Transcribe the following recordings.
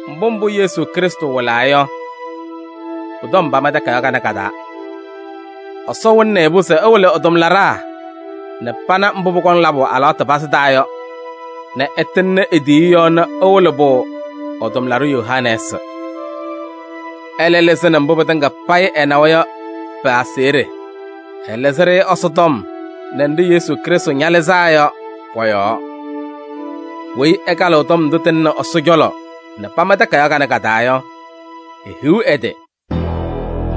Mbʋ mbʋ Yesu Krɩstʋ wɩlaa yɔ, pʋ-tɔm pama takayaɣ kanɛ ka-taa. Ɛsɔ wɩlɩnɩ-ɩ-pʋ se ɛwɩlɩ ɛ-tʋmlaɖaa nɛ pana mbʋ pʋkɔŋ labʋ alɩwaatʋ pazɩ taa yɔ nɛ ɛtɩŋnɩ e-tiyiyu yɔɔ nɛ ɛwɩlɩ-pʋ ɛ-tʋmlaɖʋ Yohanɛɛsɩ. Ɛlɛ lɩzɩnɩ mbʋ pɩtɩŋa payɩ ɛnawa yɔ pɩ-aseɣɖe: ɛlɩzɩ-ɖɩ Ɛsɔtɔm nɛ nɖɩ Yesu Krɩstʋ ñalɩzaa yɔ pɔ-yɔɔ. Weyi ɛkalɩɣ tɔm ndʋ tɩlɩnɩ Ɛsɔ cɔlɔ nɛ pama takayaɣ kanɛ ka-taa yɔ, ehiɣ ɛ-tɩ!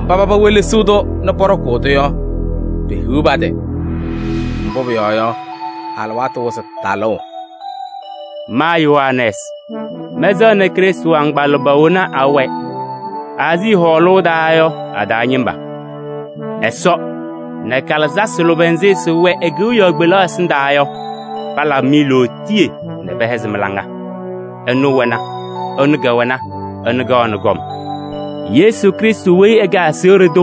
Mba paba ñewelesiɣ-tʋ nɛ pɔɖɔkʋʋ-tʋ yɔ, pehiɣ pa-tɩ! Mbʋ pʋyɔɔ yɔ, alɩwaatʋ wɩzɩ talʋʋ. Ma Yohanɛɛsɩ, mɛnsɛɣnɩ Krɩstʋ agbaa lʋbɛ wena awɛ Aazii hɔɔlʋʋ taa yɔ a-taa ñɩma: Ɛsɔ nɛ kalɩzasɩ lʋbɛ nzɩ sɩwɛ e-kewiyaɣ kpelaɣ ɛsɩndaa yɔ, palabɩ-mɩ lootiye nɛ pɛhɛzɩ mɩ-laŋa. Ɛnʋ wɛna, ɛnʋ kɛwɛna, ɛnʋ kaɣnɩ kɔm. Yesu Krɩstʋ weyi ɛkɛ aseɣɖe tʋ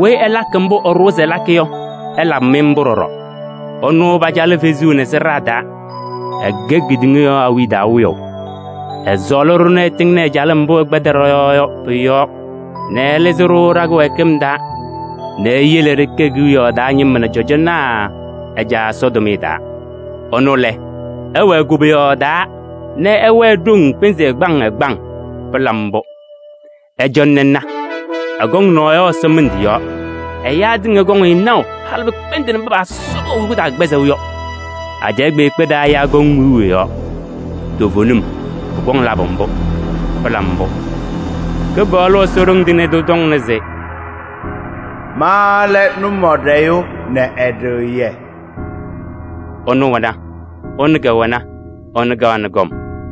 weyi ɛlakɩ mbʋ ɛɖʋwa se ɛlakɩ yɔ, ɛlabɩ-mɩ mbʋ ɖɔɖɔ. Ɛnʋ pacalɩ fezuu nɛ sɩɖaa taa, ɛkɛ kedeŋa yɔɔ awiya taa Wiyaʋ. Ɛsɔɔlɩ-ɖʋ nɛ ɛtɩŋnɩ ɛ-calɩm mbʋ ɛkpɛdɩ ɖɔ-yɔɔ yɔ pʋ-yɔɔ nɛ ɛlɩzɩ-ɖʋ ɖa-kɩwɛɛkɩm taa nɛ eyele ɖɩkɛ kewiyaɣ taa ñɩma nɛ cɔjɔnaa ɛ-Caa Ɛsɔ tʋmɩyɛ taa. Ɛnʋ lɛ, ɛwɛɛ koboyaɣ taa nɛ ɛwɛɛ ɖoŋ pɩnzɩ ɛgbaŋ ɛgbaŋ! Pɩla mbʋ! Ɩcɔnɩ ɩna, ɛkɔŋ naɣ yɔ ɛsɔmɩndʋ yɔɔ! Ɛyaa tɩŋa kɔŋ-ɩ naʋ, halɩ pɩkpɛndɩnɩ mba paasɔbɩ ɛ-hʋyʋʋ taa kɩkpɛzɩŋ yɔ. Ajɛɛ kpeekpe taa ɛyaa kɔŋ wiu ɛ-yɔɔ. Toovenim, pʋkɔŋ labʋ mbʋ! Pɩla mbʋ! Kɩpaɣlʋ Ɛsɔ Ɖoŋ Tɩŋa Tʋ tɔŋna se: “Ma lɛ Nʋmɔɖɛyʋ nɛ Ɛɖɩɣyɛ.” Ɛnʋ wɛna, ɛnʋ kɛwɛna, ɛnʋ kaɣnɩ kɔm.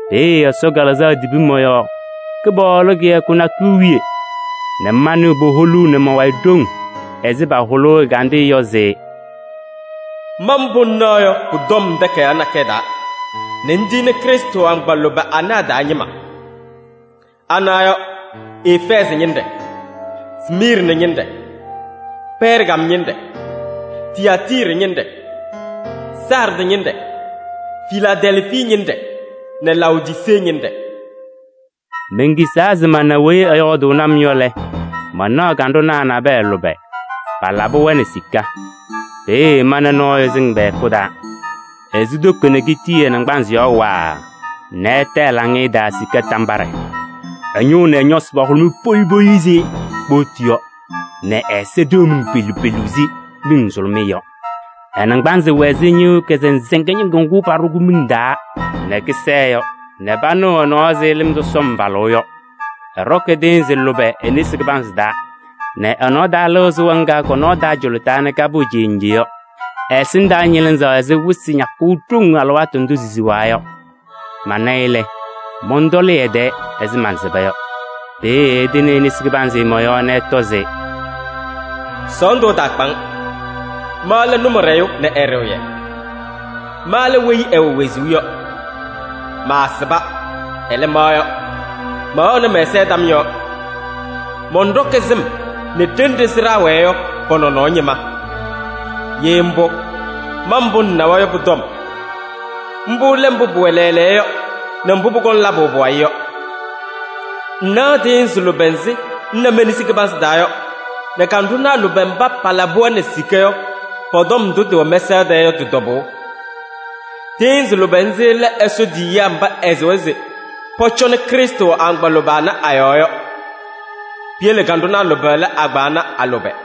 Peeye Ɛsɔ Kalɩzaɣ tibi mɔ-yɔɔ Kɩpaɣlʋ kɩyakʋ nakʋyʋ wiye nɛ manɩɣ puholuu nɛ ma-wayɩ ɖoŋ ɛzɩ pahʋlʋʋ ɛgandɩyɛ yɔ se: “Ma mbʋ ŋnaɣ yɔ pʋ-tɔm takayaɣ nakɛyɛ taa nɛ ŋtiyini Krɩstʋ agbaa lʋbɛ anɛ a-taa ñɩma. Ana yɔ: Efɛɛzɩ ñɩnɖɛ nɛ Smiirnɩ ñɩnɖɛ nɛ Pɛɛrgam ñɩnɖɛ nɛ Tiyaatiiri ñɩnɖɛ nɛ Saardɩ ñɩnɖɛ nɛ Filaadɛlfii ñɩnɖɛ nɛ Laodisee ñɩnɖɛ.” Menkisaa se mana weyi ɛyɔɔdʋʋnɩ-m yɔ lɛ, manaɣ kanɖʋnaa nabɛyɛ lʋbɛ, palabɩ-wɛ nɛ sika. Peeye mana nɔɔyʋ sɩŋ pɛ-hɛkʋ taa. Esu toko nɛ kitii ɛ-naŋgbanzɩ yɔɔ waaa nɛ ɛta ɛ-laŋɩyɛ taa sika tambaɖɛ. Ɛ-ñʋʋ nɛ ɛ-ñɔsɩ pahʋlʋmɩ poyi poyi ɛzɩ kpootu yɔ nɛ ɛ-ɛza ɖeɣ miŋ pelu pelu ɛzɩ miŋ nzʋlʋmɩyɛ yɔ. Ɛ-naŋgbanzɩ wɛ ɛzɩ ñɩɣyʋʋ kazɩnzɩŋa ñɩŋgʋ ŋgʋ paɖʋ miŋ taa nɛ kɩsɛɛ yɔ nɛ panɩɣ ɛ-nɔɔ ɛzɩ lɩm sɔsɔm falʋʋ yɔ. Ɛɖɔkɩ tɩɩnzɩ lʋbɛ e-nesi kɩbanzɩ taa nɛ ɛ-nɔɔ taa lɩɣ sɩɣa ŋga kɔ-nɔɔ taa cʋlʋtaa nɛ kapɩɣ cenje yɔ. Ɛ-ɛsɩndaa ñɩlɩzaɣ ɛzɩ wɩsɩ ñakʋʋ ɖoŋ alɩwaatʋ ndʋ sisiɣa yɔ. Mana-ɩ lɛ, mɔntɔlɩ ɛ-tɛɛ ɛzɩ mansɩba yɔ. Peeye ɛtɩnɩ e-nesi kɩbanzɩ mɔ-yɔɔ nɛ ɛtɔ se: “Sɔɔndʋ ɛtaakpa-ŋ! Ma lɛ Nʋmɔɖɛyʋ nɛ Ɛɖɩɣyɛ. Ma lɛ weyi ɛwɛ wezuu yɔ. Maasɩba, ɛlɛ, ma yɔ, mɛwɛɣnɩ mɛ-ɛza tam yɔɔ. Mɔnɖɔkɩ sɩm nɛ ɖenɖe sɩɖaa wɛɛ yɔ pɔ-nɔnɔɔ ñɩma. Ye mbʋ, ma mbʋ ŋnawa yɔ pʋ-tɔm. Mbʋ lɛ mbʋ pʋwɛ lɛɛlɛɛyɔ yɔ nɛ mbʋ pʋkɔŋ labʋ pʋwayɩ yɔ. Ŋnaɣ tɩɩnzɩ lʋbɛ nzɩ ŋna me-nesi kɩbanzɩ taa yɔ nɛ kanɖʋnaa lʋbɛ mba palabɩ-wɛ nɛ sika yɔ, pɔ-tɔm ndʋ tɩwɛ mɛsaɣ tɛɛ yɔ tɩ-tɔbʋʋ: tɩɩnzɩ lʋbɛ nzɩ lɛ Ɛsɔ tiyiyaa mba ɛsɩwa se pɔcɔnɩ Krɩstʋ agbaa lʋbɛ ana a-yɔɔ yɔ. Piyele kanɖʋnaa lʋbɛ lɛ agbaa ana a-lʋbɛ.”